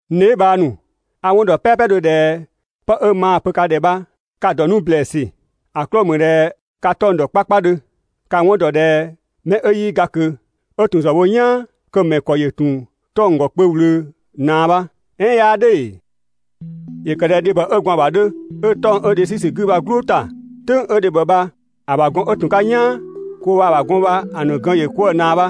N dheebhang ‑nu, a‑ 'wɔn ‑dɔ "pɛɛpɛdhö ꞊dhɛ 'pë 'ö maa‑ pö ka ‑dhɛ bha ka‑ ‑dɔ 'nu ‑blɛɛsü, ‑a 'klɔɔ‑ ‑mü ꞊dhɛ ka 'tɔng‑ ‑dɔ 'kpakpadhö. Ka‑ 'wɔn ‑dɔ ꞊dhɛ mɛ 'ö 'yii ga ꞊kö, 'ö ‑tun ‑zë wo "yaan, kö‑ ‑mɛ ‑kɔ ‑yö ‑tun 'tɔng‑ ‑gɔ kpö ꞊wlöö ꞊naa bha. "Ɛɛn 'yaa "dhʋ̈ ‑ee? ‑Yö ‑kë ꞊dhɛ dhebhɔ 'ö gwaan‑ ‑bha ‑a 'dhö. 'Ö 'tɔng‑ 'ö dhe 'sü ‑sü 'gü bha‑ "gblʋʋ ‑ta, "tʋ̈ng 'ö dhebhɔ bha‑ ‑bha gɔn 'ö ‑tun 'ka "yaan, kö waa‑ ‑bha gɔn bha‑ ‑nu gën ‑yö 'kwëë‑ ꞊naa bha.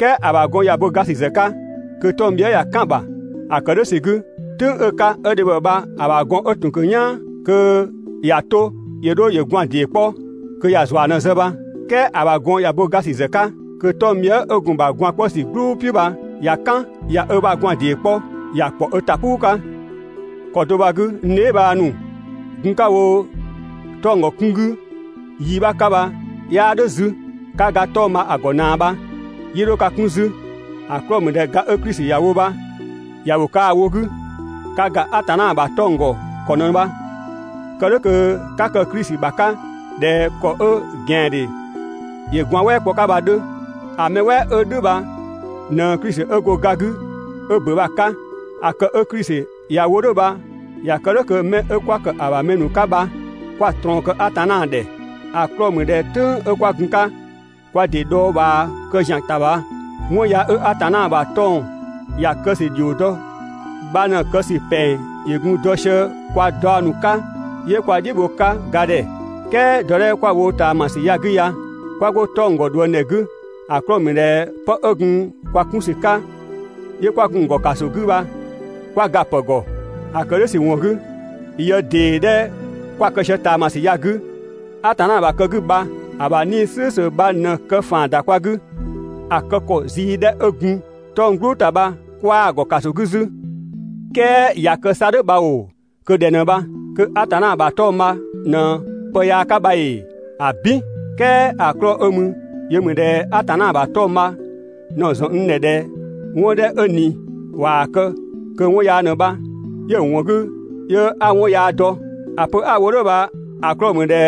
"Kɛɛ ‑a ‑bha gɔn ꞊ya bo ga ‑sü ‑zë 'ka, kö 'tɔng‑ bhië" ꞊ya "kan‑ ‑bha. ‑A ‑kë "dhʋ̈ ‑sü 'gü, "tʋ̈ng 'ö‑ 'ka 'ö dhebhɔ bha‑ ‑bha gɔn 'dhö ‑tun 'ka "yaan, kö ‑ya 'to ‑yö 'dho ‑yö gwaan‑ ‑dee 'kpɔ, kö ‑yö ‑zua ꞊në‑ zë bha. "Kɛɛ ‑a ‑bha gɔn ꞊ya bo ga ‑sü ‑zë 'ka, kö 'tɔng‑ bhië" 'ö gun‑ ‑bha gwaan‑ 'kpɔ ‑sü "gblʋʋ "piʋ̈ bha ꞊ya "kan, ꞊ya ö ‑bha gwaan‑ ‑dee 'kpɔ, ‑ya ‑kpɔ ö ‑ta "puu 'ka. ‑Kɔ do bha‑ 'gü, n dheebhang ‑nu, gun 'ka‑ wo 'tɔng‑ ‑gɔ 'kun 'gü yi 'bha 'ka bha 'yaa "dhʋ̈ 'zü. 'Ka ga 'tɔng‑ bha‑ ‑gɔ ꞊naa bha, 'yii 'dho ka 'kun 'zü, ‑a 'klɔɔ‑ ‑mü ꞊dhɛ ga 'ö Klisi ‑ya wo bha ‑ya ‑wo kaa‑ wo 'gü, ka ‑ga Atanna ‑bha 'tɔng‑ ‑gɔ ‑kɔ ꞊në bha. Kë "dhʋ̈ kö 'ka kë Klisi ‑bha 'ka ꞊dhɛ ‑kɔ 'ö ꞊gɛandhe ‑yö gwaan‑ "wɛɛ kpɔ‑ 'ka bha‑ 'dhö. ‑A mɛ "wɛɛ 'ö "dhʋ̈ bha ꞊në Klisi 'ö go ga 'gü 'ö ‑bö bha‑ 'ka. ‑A kë 'ö Klisi ‑ya wo "dhʋ̈ bha ‑ya ‑kë "dhʋ̈ kö 'mɛ 'ö 'kwa ‑kë ‑a ‑bha mɛ ‑nu 'ka 'kwa ꞊trɔɔn kë Atanna ‑dhɛ. ‑A 'klɔɔ‑ ‑mü ꞊dhɛ "tʋ̈ng 'kwa gun‑ 'ka kwa ‑dɩ dhɔɔbhaa kë ‑zian ‑ta bha, 'wɔn yaa 'ö Atanna ‑bha 'tɔng‑ ‑ya kë ‑sü ‑dhio dɔ bha ꞊në‑ kë ‑sü ‑pɛng ‑yö gun dɔ sië kwa daɔ ‑nu 'ka 'yö kwa "dhiʋ̈ bho‑ 'ka ga ‑dhɛ. "Kɛɛ dɔ 'dhɛ 'kö 'kwa‑ wo ꞊taamasü ya‑ 'gü ya, 'kwa 'go 'tɔng‑ ‑gɔ ꞊dhuëngdhɛ 'gü, ‑a 'klɔɔ‑ ‑mü ꞊dhɛ pë 'ö gun kwa 'kun ‑sü 'ka 'yö kwa gun‑ ‑gɔ ‑kaso 'gü bha 'kwa ga‑ ‑pë ‑gɔ. ‑A ‑kë "dhʋ̈ ‑sü ‑wɔn 'gü, yë ‑dee 'dhɛ 'kwa‑ kë sië ꞊taamasü ya‑ 'gü, Atanna ‑bha kë 'gü bha‑ ‑bha 'Nii‑ "slʋ̈ʋ̈slʋ̈ bha ꞊në‑ kë ‑faan ‑da kwa 'gü. ‑A kë ‑kɔ zii 'dhɛ 'ö gun 'tɔng‑ "gblʋʋ ‑ta bha 'kwaa‑ ‑gɔ ‑kaso 'gü 'zü. "Kɛɛ ꞊ya kë 'sa "dhʋ̈ bha ‑oo, kö ꞊dhɛ ꞊në bha? Kö Atanna ‑bha 'tɔng‑ bha ꞊në pë yaa 'ka bha ‑ee? ‑Abin! "Kɛɛ ‑a 'klɔɔ‑ 'ö mü yö ‑mü ꞊dhɛ Atanna ‑bha 'tɔng‑ bha ꞊në‑ ‑zɔn n ‑dhɛ ꞊dhɛ 'wɔn 'dhɛ 'ö ꞊ni ꞊waa‑ kë kö 'wɔn yaa ꞊në bha, 'yö‑ ‑wɔn 'gü 'yö 'a 'wɔn yaa dɔ. ‑A pö 'a‑ wo "dhʋ̈ bha‑ 'klɔɔ‑ ‑mü ꞊dhɛ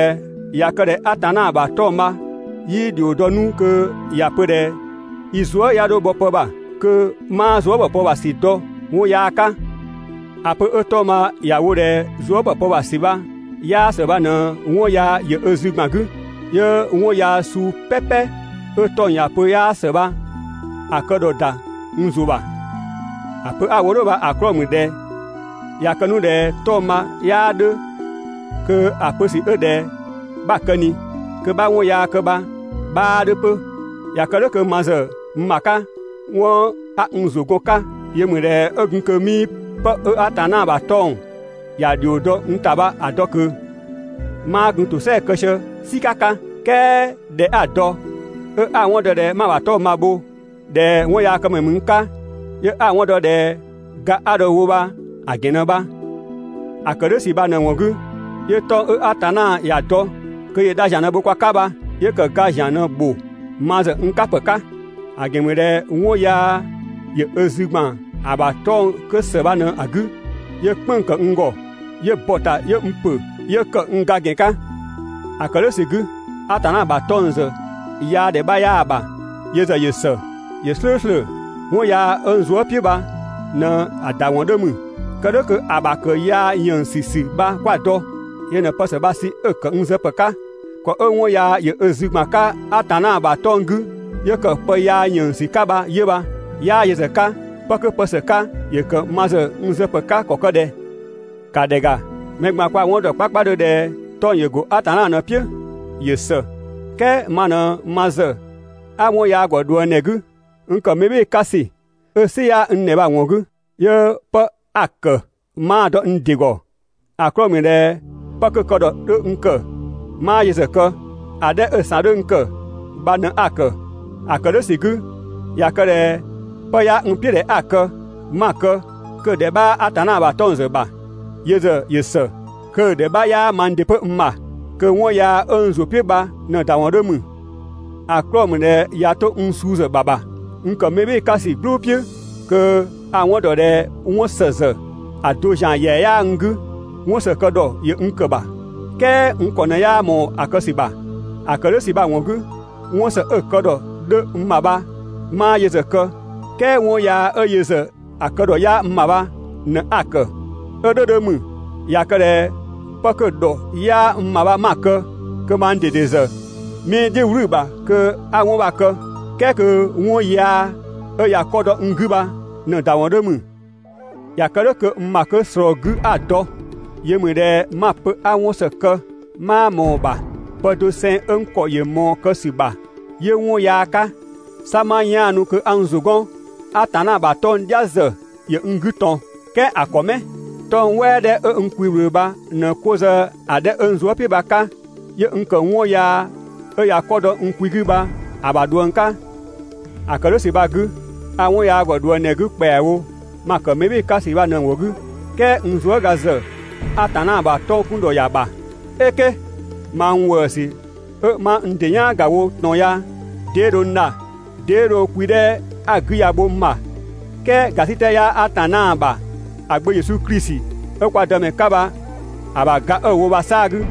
꞊ya kë ꞊dhɛ Atanna ‑bha 'tɔng‑ bha 'yii ‑dhio dɔ 'nu kö ‑ya pö ꞊dhɛ i zuë" ya 'dho bhɔ pë ‑bha, kö 'maa zuë" ‑bhɔ pë ‑bha ‑sü dɔ 'wɔn yaa 'ka. ‑A pö 'ö 'tɔng‑ bha ‑ya wo ꞊dhɛ zuë" ‑bhɔ pë ‑bha ‑sü bha 'yaa ‑së bha ꞊në 'wɔn yaa ‑yö ö zü ‑gban 'gü, 'yö 'wɔn yaa suu "pɛpɛ 'ö 'tɔng‑ ‑ya pö 'yaa ‑së bha‑ kë ‑dhɔ ‑da n ‑zʋ ‑bha. ‑A pö 'a‑ wo "dhʋ̈ bha‑ 'klɔɔ‑ ‑mü ꞊dhɛ ꞊ya kë 'nu ꞊dhɛ 'tɔng‑ bha 'yaa 'dhö, kö ‑a pö ‑sü 'ö ꞊dhɛ 'bha‑ kë ꞊ni kö 'bha 'wɔn yaa kë bha‑ 'bhaa 'dhö 'pö. ꞊Ya kë "dhʋ̈ kö ma ‑zë n ‑bha 'ka, 'wɔn 'a n ‑zʋ gɔn‑ 'ka yö ‑mü ꞊dhɛ 'ö gun kö 'mii 'pë 'ö Atanna ‑bha 'tɔng‑ ‑ya ‑dhio dɔ ‑a 'bha dɔ ꞊kö, 'maa gun ‑tosɛa kë sië "sika 'ka. "Kɛɛ ꞊dhɛ 'a‑ dɔ, 'ö 'a‑ 'wɔn dɔ ꞊dhɛ 'ma‑ ‑bha 'tɔng‑ bho, ꞊dhɛ 'wɔnyaakëmɛ ‑mü n 'ka, 'yö 'a‑ 'wɔn dɔ ꞊dhɛ ga 'a dho‑ wo bha‑ ‑gɛn ꞊në bha. ‑A ‑kë "dhʋ̈ ‑sü bha ꞊në‑ ‑wɔn 'gü, 'yö 'tɔng‑ 'ö Atanna ‑ya dɔ kö ‑yö dha ‑zian ꞊në‑ bho kwa 'ka bha, 'yö ‑kë ga ‑zian ꞊në‑ ‑bho ma ‑zë n 'ka ‑pë 'ka. ‑A ‑gɛn ‑mü ꞊dhɛ 'wɔn yaa ‑yö ö zü ‑gban ‑a ‑bha 'tɔng‑ 'kö ‑së bha ꞊në‑ 'gü 'yö "kpënng‑ ‑kë n ‑gɔ, 'yö bɔ‑ ‑ta 'yö n ‑pö, 'yö ‑kë n ga ‑gɛn 'ka. ‑A ‑kë "dhʋ̈ ‑sü 'gü, Atanna ‑bha 'tɔng‑ ‑zë yaa ‑dhɛ 'bha 'yaa‑ ‑bha, yö ‑zë ‑yö ‑së, ‑yö "slʋ̈ʋ̈slʋ̈. 'Wɔn yaa 'ö n zuë" "piʋ̈ bha ꞊në‑ ‑da ‑wɔn 'dhö ‑mü. Kë "dhʋ̈ kö ‑a ‑bha ‑kë yaa ‑yënngsü ‑sü bha 'kwa‑ dɔ. Yö ꞊në pë ‑së bha‑ sü 'ö‑ ‑kë n zë ‑pë 'ka. ‑Kɔ 'ö 'wɔn yaa ‑yö ö zü ‑gban 'ka Atanna ‑bha 'tɔng‑ 'gü 'yö ‑kë pë yaa ‑yënngsü 'ka bha 'yö bha. 'Yaa yö ‑zë 'ka, 'pë 'kö pë ‑së 'ka ‑yö ‑kë ma ‑zë n zë ‑pë 'ka ‑kɔ ‑kë ꞊dhɛ? ‑Ka ‑dhɛ ‑ga, mɛ ꞊gban kwa‑ 'wɔn ‑dɔ 'kpakpadhö ꞊dhɛ 'tɔng‑ ‑yö ‑go Atanna ꞊në‑ "piʋ̈. ‑Yö ‑së, "kɛɛ ma ꞊në ma ‑zë 'a 'wɔn yaa ‑gɔ ꞊dhuëngdhɛ 'gü, n ‑kë mɛ "bhɩɩ‑ 'ka ‑sü 'ö "sɩ 'yaa n ‑dhɛ bha‑ ‑wɔn 'gü, 'yö 'pë 'a‑ ‑kë 'maa‑ dɔ n ‑dɩ ‑gɔ. ‑A 'klɔɔ‑ ‑mü ꞊dhɛ 'pë 'kö‑ kë ‑dhɔ 'dhö n ‑bha 'maa yö ‑zë kë, ‑a 'dhɛ 'ö‑ ‑san 'dhö n ‑kë bha ꞊në 'a‑ ‑kë. ‑A ‑kë "dhʋ̈ ‑sü 'gü, ꞊ya kë ꞊dhɛ 'pë 'yaa n "piʋ̈ ꞊dhɛ 'a‑ kë, 'ma‑ kë, kö‑ ‑dhɛ 'bhaa Atanna ‑bha 'tɔng‑ ‑zë ‑bha, yö ‑zë ‑yö ‑së, kö‑ ‑dhɛ 'bha 'yaa mang ‑dɩ 'pö n ‑bha, kö 'wɔn yaa 'ö n ‑zʋ "piʋ̈ bha ꞊në‑ ‑da ‑wɔn 'dhö ‑mü. ‑A 'klɔɔ‑ ‑mü ꞊dhɛ ꞊ya 'to n suu ‑zë ‑bha ‑bha, n ‑kë mɛ "bhɩɩ‑ 'ka ‑sü "gblʋ̈ "piʋ̈, kö a‑ 'wɔn ‑dɔ ꞊dhɛ 'wɔn ‑së ‑zë ‑a do ‑zian ‑yɛa 'yaa n 'gü. 'Wɔn ‑së kë ‑dhɔ ‑yö ‑kë n ‑bha, "kɛɛ n ‑kɔ ꞊në 'yaa ꞊mɔɔ‑ kë ‑sü ‑bha. ‑A ‑kë "dhʋ̈ ‑sü bha‑ 'gü, 'wɔn ‑së 'ö‑ kë ‑dhɔ 'dhö n ‑bha bha 'maa yö ‑zë kë, "kɛɛ 'wɔn yaa 'ö yö ‑zë kë ‑dhɔ 'yaa n ‑bha bha ꞊në 'a‑ ‑kë. 'Ö "dhʋ̈ 'dhö ‑mü, ꞊ya kë ꞊dhɛ 'pë 'kö kë ‑dhɔ 'yaa n ‑bha 'ma‑ kë, kö mang ꞊dede ‑zë 'mii‑ "dhiʋ̈ "wlü ‑bha kö 'a 'wɔn bha‑ kë, "kɛɛ kö 'wɔn yaa 'ö ꞊ya 'kɔ dɔ n 'gü bha ꞊në‑ ‑da ‑wɔn 'dhö ‑mü. ꞊Ya kë "dhʋ̈ kö n ‑bha 'kö ꞊slɔɔ‑ 'gü 'a‑ dɔ, yö ‑mü ꞊dhɛ 'ma‑ pö 'a 'wɔn ‑së kë, 'maa ꞊mɔɔ‑ ‑bha. Pë doseng 'ö n ‑kɔ ‑yö ꞊mɔɔ‑ kë ‑sü ‑bha, 'yö 'wɔn yaa 'ka. 'Sa 'ma 'yaanu kö 'a n ‑zʋ 'gɔn, Atanna ‑bha 'tɔng‑ "dhia ‑zë ‑yö n 'gü ꞊tɔn, "kɛɛ ‑a ‑kɔ 'mɛ? 'Tɔng‑ "wɛɛ 'dhɛ 'ö n kwi ꞊wlöö bha ꞊në 'ko zë‑ 'dhɛ 'ö n zuë" "piʋ̈ bha‑ 'ka, 'yö n ‑kë 'wɔn yaa 'ö ꞊ya 'kɔ dɔ n kwi 'gü bha‑ ‑bha ꞊dhuëng 'ka. ‑A ‑kë "dhʋ̈ ‑sü bha‑ 'gü, a 'wɔn yaa ‑gɔ ꞊dhuëngdhɛ 'gü ‑kpɛawo ma ‑kë mɛ "bhɩɩ‑ 'ka ‑sü ꞊në‑ ‑wɔn 'gü, "kɛɛ n zuëga ‑zë Atanna ‑bha 'tɔng‑ 'kun ‑dhɔ ‑ya ‑bha. "Eke! Mang ‑wëësü 'ö 'ma n ‑dɩ "yaan ‑ga wo ꞊tɔn ya 'dee dho n dha, 'dee dho kwi 'dhɛ 'a‑ 'gü ya‑ bho n ‑bha? "Kɛɛ ‑gasitɛ 'yaa Atanna ‑bha ‑a Gbö Yesu Klisi 'ö kwa Dëmɛ 'ka bha‑ ‑bha ga 'ö‑ wo bha‑ 'saa‑ 'gü.